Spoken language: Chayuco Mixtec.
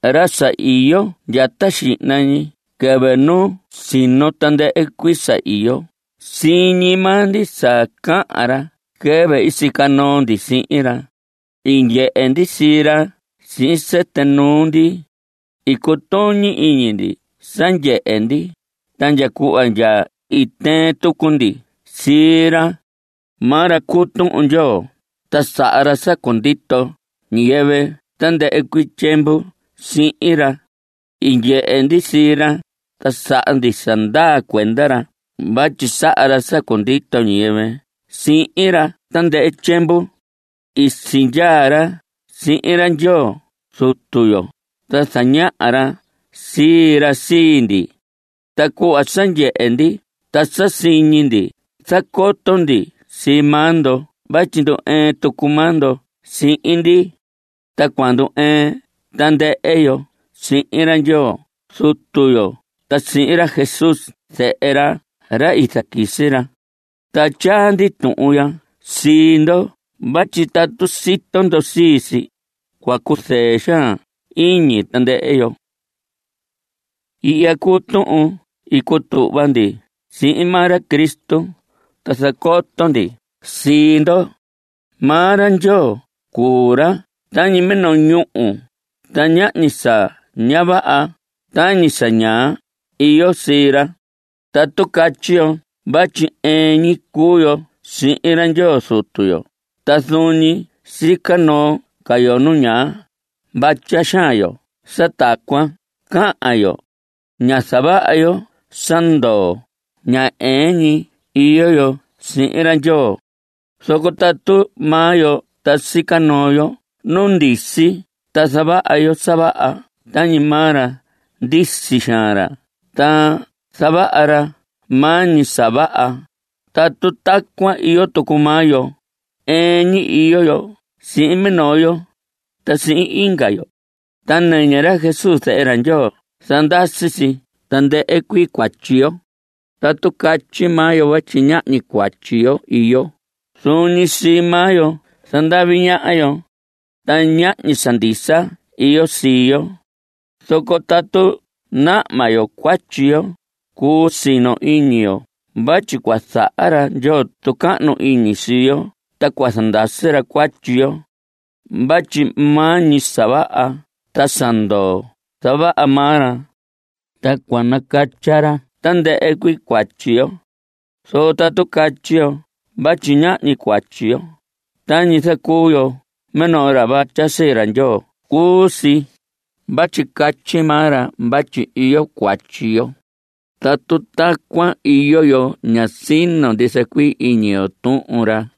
Ra sa iyo ndya ta xihna ñi quɨvɨ nu i sino tandɨhɨ cuii sa iyo, siñi maa ndi sa cahan ra quɨvɨ i sica noo ndi sihin ra. I ndyehe ndi sii ra sihin sɨtɨ nuu ndi. I cutuñi iñi ndi sa ndyehe ndi. Ta ndya cuhva ndya i tɨɨn tucu ndi sii ra. Maa ra cuu Tuhun Ndyoo, ta saha ra sa cundito ñiyɨvɨ tandɨhɨ cuii tyiemvu sihin ra. I ndyehe ndi sii ra, ta saha ndi sa ndaa cuenda ra vatyi saha ra sa cundito ñiyɨvɨ sihin ra tandɨhɨ tyiemvu. I sindyaa ra sihin ra Ndyoo Zutu yo, ta zañaha ra sii ra sii ndi. Ta cuhva sa ndyehe ndi ta sa siñi ndi, zacoto ndi sii maa ndo vatyi ndu‑ɨɨn tucu maa ndo sihin ndi. Ta cua ndu‑ɨɨn tandɨhɨ yo sihin ra Ndyoo Zutu yo ta sihin ra Jesús zehe ra, ra i zaquisi ra. Ta tyaa ndi tuhun ya sii ndo vatyi tatu sito ndo sii si, cua cuzɨɨ xaan iñi tandɨhɨ yo. Ihya cuu tuhun i cutuhva ndi sihin maa ra Cristo, ta zacoto ndi sii ndo. Maa ra Ndyoo cuu ra tañi minoo ñúhu, ta ñahñi sa ña vaha (tañi sa ñaa) iyo sii ra. Tatu catyi yo vatyi ɨɨn ñi cuu yo sihin ra Ndyoo Zutu yo, ta zuun ñi sica noo ca yo nu ñaa, vatya xaan yo sa tacuan cahan yo. Ña zavaha yo sa ndoo. Ña ɨɨn ñi iyo yo sihin ra Ndyoo. Zoco tatu maa yo ta sica noo yo nu ndisi ta zavaha yo sa vaha tañi maa ra ndisi xaan ra ta zavaha ra maa ñi sa vaha, tatu tacuan iyo tucu maa yo, ɨɨn ñi iyo yo sihin minoo yo ta sihin inga yo. Ta nɨñɨ ra Jesús zehe ra Ndyoo zandasi si tandɨhɨ cuii cuatyi yo. Tatu catyi maa yo vatyi ñahñi cuatyi yo iyo, zuun ñi sii maa yo zandavi ñaha yo. Ta ñahñi sa ndisa iyo sii yo. Zoco tatu nahma yo cuatyi yo, cuu sino iñi yo vatyi cua zaha ra Ndyoo tucahnu iñi sii yo ta cua zandasi ra cuatyi yo. Vatyi maa ñi sa vaha ta sa ndoo zavaha maa ra, ta cua nacatya ra tandɨhɨ cuii cuatyi yo. Zoco tatu catyi yo vatyi ñahñi cuatyi yo, tañi zacuu yo minoo ra vatya sii ra Ndyoo cuu si (vatyi catyi maa ra vatyi iyo cuatyi yo). Tatu tacuan iyo yo, ña sino ndisa cuii iñi yo Tuhun ra.